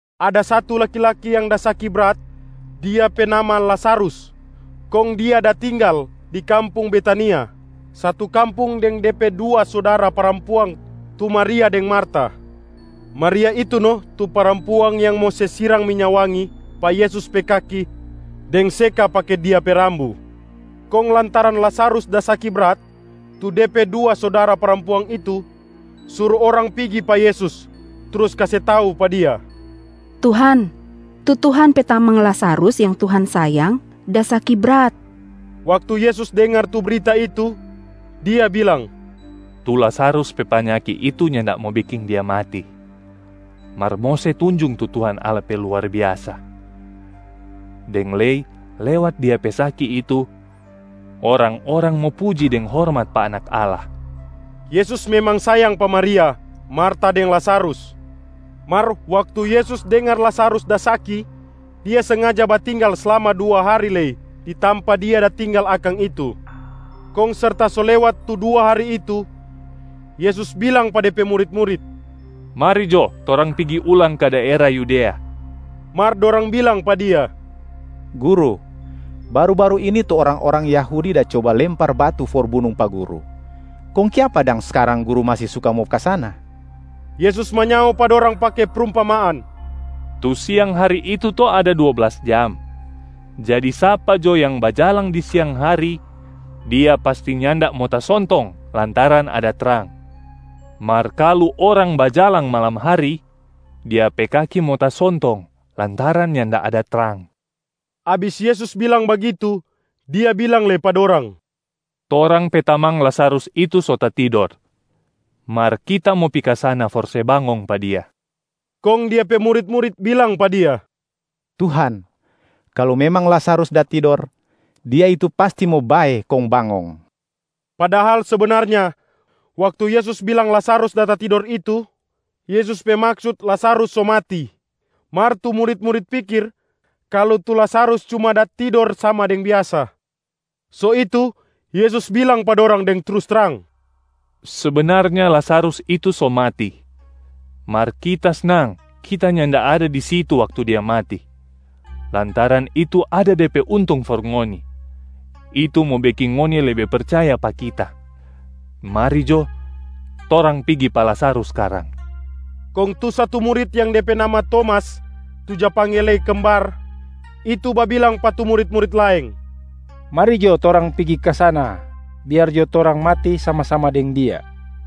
Ada satu laki-laki yang da saki brat. Dia pe nama Lazarus, kong dia da tinggal di kampung Betania, satu kampung deng de pe dua sudara parampuang tu Maria deng Marta. Maria itu no tu parampuang yang mo se sirang minya wangi pa Yesus pe kaki deng seka pake dia pe rambu. Kong lantaran Lazarus da saki brat, tu de pe dua sudara parampuang itu suru orang pigi pa Yesus, trus kase tau pa Dia, “Tuhan, tu Tuhan pe tamang Lazarus yang Tuhan sayang da saki brat.” Waktu Yesus dengar tu brita itu, Dia bilang, “Tu Lazarus pe panyaki itu nyanda mo beking dia mati, mar mo se tunjung tu Tuhan Allah pe luar biasa. Deng lei lewat dia pe saki itu, orang-orang mo puji deng hormat pa Anak Allah.” Yesus memang sayang pa Maria, Marta deng Lazarus. Mar waktu Yesus dengar Lazarus da saki, Dia sengaja batinggal slama dua hari lei di tampa Dia da tinggal akang itu. Kong serta so lewat tu dua hari itu, Yesus bilang pa De pe murit-murit, “Mari jo torang pigi ulang ka daera Yudea.” Mar dorang bilang pa Dia, “Guru, baru-baru ini tu orang-orang Yahudi da coba lempar batu for bunung pa Guru. Kong kiapa dang skarang Guru masi suka mo ka sana?” Yesus manyao pa dorang pake prumpamaan, “Tu siang hari itu to ada dua blas jam. Jadi sapa jo yang bajalang di siang hari, dia pasti nyanda mo tasontong lantaran ada trang.a Mar kalu orang bajalang malam hari, dia pe kaki mo tasontong lantaran nyanda ada trang.” Abis Yesus bilang bagitu, Dia bilang lei pa dorang, “Torang pe tamang Lazarus itu so tatidor, mar Kita mo pi ka sana for se bangong pa dia.” Kong Dia pe murit-murit bilang pa Dia, “Tuhan, kalu memang Lazarus da tidor, dia itu pasti mo bae kong bangong.” Padahal sebenarnya, waktu Yesus bilang Lazarus da tatidor itu, Yesus pe maksut Lazarus so mati. Mar tu murit-murit pikir kalu tu Lazarus cuma da tidor sama deng biasa. So itu, Yesus bilang pa dorang deng trus trang, “Sebenarnya Lazarus itu so mati. Mar Kita snang Kita nyanda ada di situ waktu dia mati, lantaran itu ada de pe untung for ngoni, itu mo beking ngoni lebe percaya pa Kita. Mari jo torang pigi pa Lazarus skarang.” Kong tu satu murit yang de pe nama Tomas tu ja pangge lei Kembar itu babilang pa tu murit-murit laeng, “Mari jo torang pigi ka sana, biar jo torang mati sama-sama deng Dia.”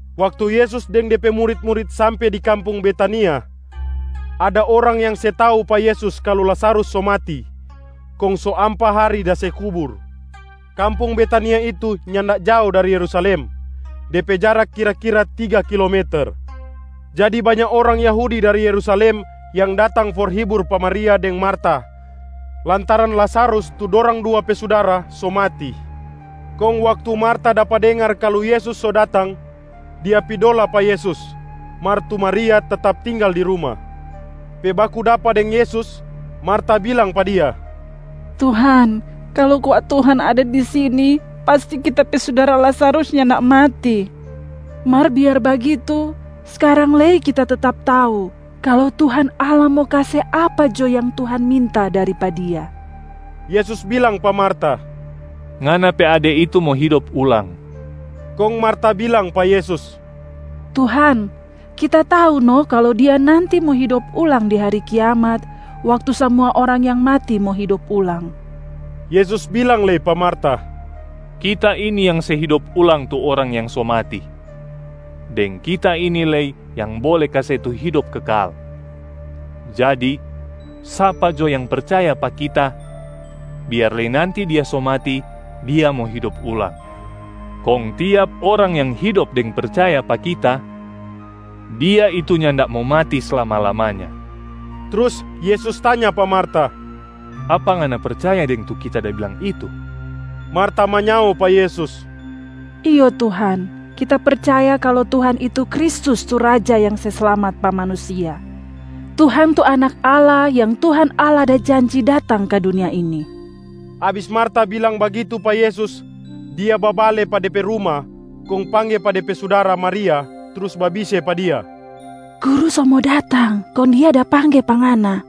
Waktu Yesus deng Dia pe murit-murit sampe di kampung Betania, ada orang yang se tau pa Yesus kalu Lazarus so mati kong so ampa hari da se kubur. Kampung Betania itu nyanda jao dari Yerusalem, de pe jarak kira-kira tiga kilometer. Jadi banya orang Yahudi dari Yerusalem yang datang for hibur pa Maria deng Marta lantaran Lazarus tu dorang dua pe sudara so mati. Kong waktu Marta dapa dengar kalu Yesus so datang, dia pi dola pa Yesus, mar tu Maria tetap tinggal di ruma. Pe baku dapa deng Yesus, Marta bilang pa Dia, “Tuhan, kalu kwa Tuhan ada di sini, pasti kita pe sudara Lazarus nyanda mati. Mar biar bagitu, skarang lei kita tetap tau kalu Tuhan Allah mo kase apa jo yang Tuhan minta dari pa Dia.” Yesus bilang pa Marta, “Ngana pe ade itu mo hidop ulang.” Kong Marta bilang pa Yesus, “Tuhan, kita tau no kalu dia nanti mo hidop ulang di hari kiamat, waktu samua orang yang mati mo hidop ulang.” Yesus bilang lei pa Marta, “Kita ini yang se hidop ulang tu orang yang so mati, deng Kita ini lei yang bole kase tu hidop kekal. Jadi, sapa jo yang percaya pa Kita, biar lei nanti dia so mati, dia mo hidop ulang. Kong tiap orang yang hidop deng percaya pa Kita, dia itu nyanda mo mati slama-lamanya.” Trus Yesus tanya pa Marta, “Apa ngana percaya deng tu Kita da bilang itu?” Marta manyao pa Yesus, “Iyo Tuhan, kita percaya kalu Tuhan itu Kristus tu Raja yang se slamat pa manusia. Tuhan tu Anak Allah yang Tuhan Allah da janji datang ka dunia ini.” Abis Marta bilang bagitu pa Yesus, dia babale pa de pe ruma kong pangge pa de pe sudara Maria trus babise pa dia, “Guru so mo datang, kong Dia da pangge pa ngana.”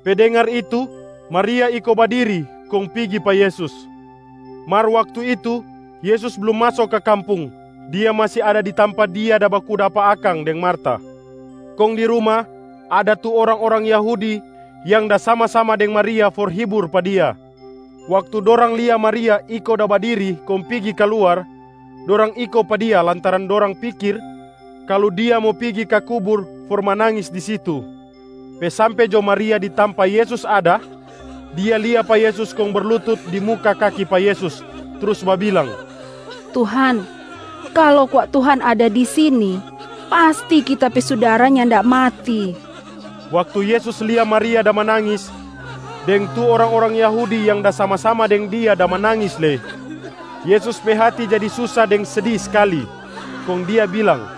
Pe dengar itu, Maria iko badiri kong pigi pa Yesus. Mar waktu itu, Yesus blum maso ka kampung, Dia masi ada di tampa Dia da baku dapa akang deng Marta. Kong di ruma, ada tu orang-orang Yahudi yang da sama-sama deng Maria for hibur pa dia. Waktu dorang lia Maria iko da badiri kong pigi kaluar, dorang iko pa dia lantaran dorang pikir kalu dia mo pigi ka kubur for manangis di situ. Pe sampe jo Maria di tampa Yesus ada, dia lia pa Yesus kong berlutut di muka kaki pa Yesus trus babilang, “Tuhan, kalu kwa Tuhan ada di sini, pasti kita pe sudara nyanda mati.” Waktu Yesus lia Maria da manangis, deng tu orang-orang Yahudi yang da sama-sama deng dia da manangis lei, Yesus pe hati jadi susa deng sedi skali. Kong Dia bilang,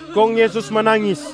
Kong Yesus manangis.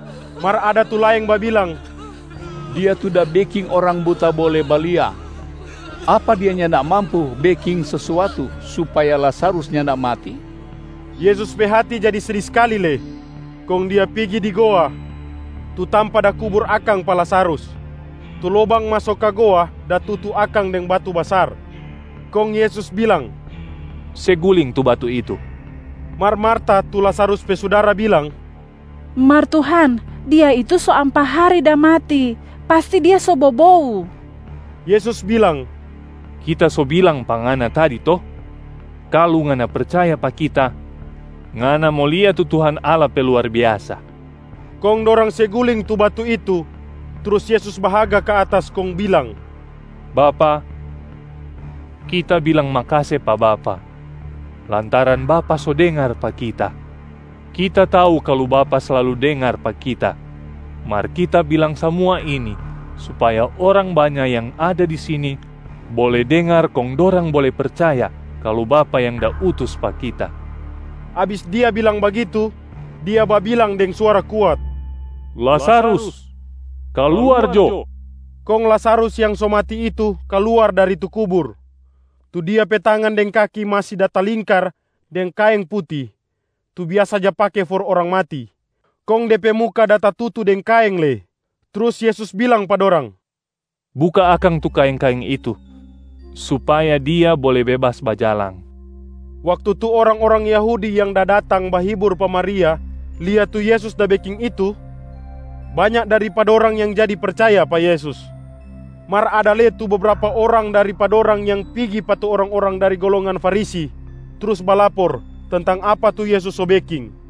Mar ada tu laeng babilang, “Dia tu da beking orang buta bole balia. Apa Dia nyanda mampu beking sesuatu supaya Lazarus nyanda mati?” Yesus pe hati jadi sedi skali lei, kong Dia pigi di goa, tu tampa da kubur akang pa Lazarus. Tu lobang maso ka goa da tutu akang deng batu basar. Kong Yesus bilang, “Se guling tu batu itu.” Mar Marta tu Lazarus pe sudara bilang, “Mar Tuhan, dia itu so ampa hari da mati, pasti dia so bobou.” Yesus bilang, “Kita so bilang pa ngana tadi to? Kalu ngana percaya pa Kita, ngana mo lia tu Tuhan Allah pe luar biasa.” Kong dorang se guling tu batu itu. Trus Yesus bahaga ka atas kong bilang, “Bapa, Kita bilang makase pa Bapa lantaran Bapa so dengar pa Kita. Kita tau kalu Bapa slalu dengar pa Kita, mar Kita bilang samua ini supaya orang banya yang ada di sini bole dengar kong dorang bole percaya kalu Bapa yang da utus pa Kita.” Abis Dia bilang bagitu, Dia babilang deng suara kuat, “Lazarus, kaluar jo!” Kong Lazarus yang so mati itu kaluar dari tu kubur. Tu dia pe tangan deng kaki masi da talingkar deng kaeng puti tu biasa ja pake for orang mati, kong de pe muka da tatutu deng kaeng lei. Trus Yesus bilang pa dorang, “Buka akang tu kaeng-kaeng itu supaya dia bole bebas bajalang.” Waktu tu orang-orang Yahudi yang da datang bahibur pa Maria lia tu Yesus da beking itu, banya dari pa dorang yang jadi percaya pa Yesus. Mar ada lei tu bebrapa orang dari pa dorang yang pigi pa tu orang-orang dari golongan Farisi trus balapor tentang apa tu Yesus so beking.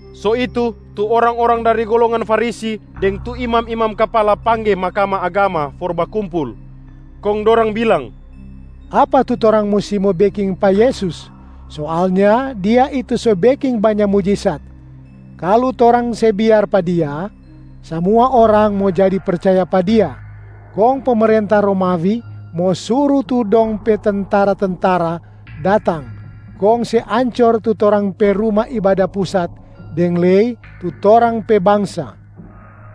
So itu, tu orang-orang dari golongan Farisi deng tu imam-imam kapala pangge Mahkamah Agama for bakumpul, kong dorang bilang, “Apa tu torang musti mo beking pa Yesus? Soalnya Dia itu so beking banya mujisat. Kalu torang se biar pa Dia, samua orang mo jadi percaya pa Dia, kong pemerenta Romawi mo suru tu dong pe tentara-tentara datang kong se ancor tu torang pe Ruma Ibada Pusat deng lei tu torang pe bangsa.”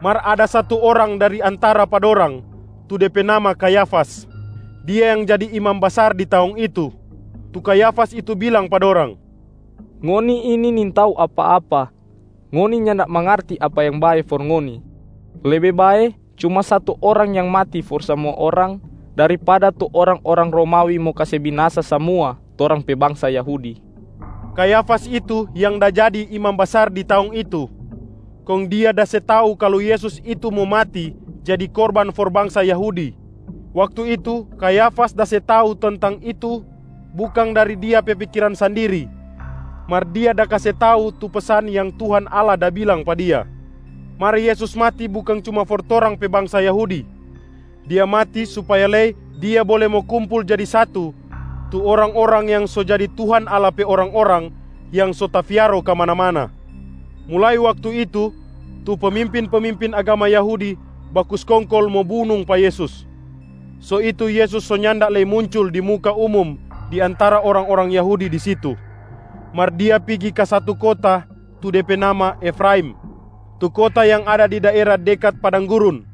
Mar ada satu orang dari antara pa dorang, tu de pe nama Kayafas. Dia yang da jadi imam basar di taong itu. Tu Kayafas itu bilang pa dorang, “Ngoni ini nintau apa-apa. Ngoni nyanda mangarti apa yang bae for ngoni. Lebe bae cuma satu orang yang mati for samua orang, daripada tu orang-orang Romawi mo kase binasa samua torang pe bangsa Yahudi.” Kayafas itu yang da jadi imam basar di taong itu, kong dia da se tau kalu Yesus itu mo mati jadi korban for bangsa Yahudi. Waktu itu Kayafas da se tau tentang itu bukang dari dia pe pikiran sandiri, mar dia da kase tau tu pesan yang Tuhan Allah da bilang pa dia. Mar Yesus mati bukang cuma for torang pe bangsa Yahudi, Dia mati supaya lei Dia bole mo kumpul jadi satu tu orang-orang yang so jadi Tuhan Allah pe orang-orang yang so tafiaro kamana-mana. Mulai waktu itu, tu pemimpin-pemimpin agama Yahudi baku skongkol mo bunung pa Yesus. So itu Yesus so nyanda lei muncul di muka umum di antara orang-orang Yahudi di situ, mar Dia pigi ka satu kota tu de pe nama Efraim, tu kota yang ada di daera dekat padang gurun.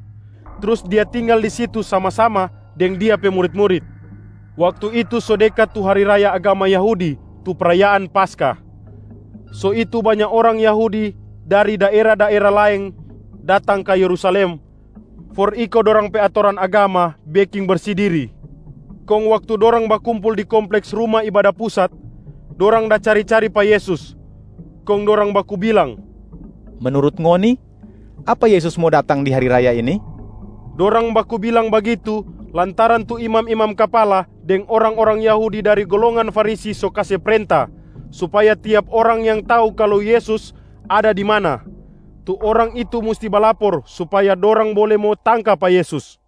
Trus Dia tinggal di situ sama-sama deng Dia pe murit-murit. Waktu itu so dekat tu hari raya agama Yahudi tu prayaan Paskah, so itu banya orang Yahudi dari daera-daera laeng datang ka Yerusalem for iko dorang pe atoran agama beking bersi diri.b Kong waktu dorang bakumpul di kompleks Ruma Ibada Pusat, dorang da cari-cari pa Yesus, kong dorang baku bilang, “Menurut ngoni, apa Yesus mo datang di hari raya ini?” Dorang baku bilang bagitu lantaran tu imam-imam kapala deng orang-orang Yahudi dari golongan Farisi so kase prenta supaya tiap orang yang tau kalu Yesus ada di mana, tu orang itu musti balapor supaya dorang bole mo tangka pa Yesus.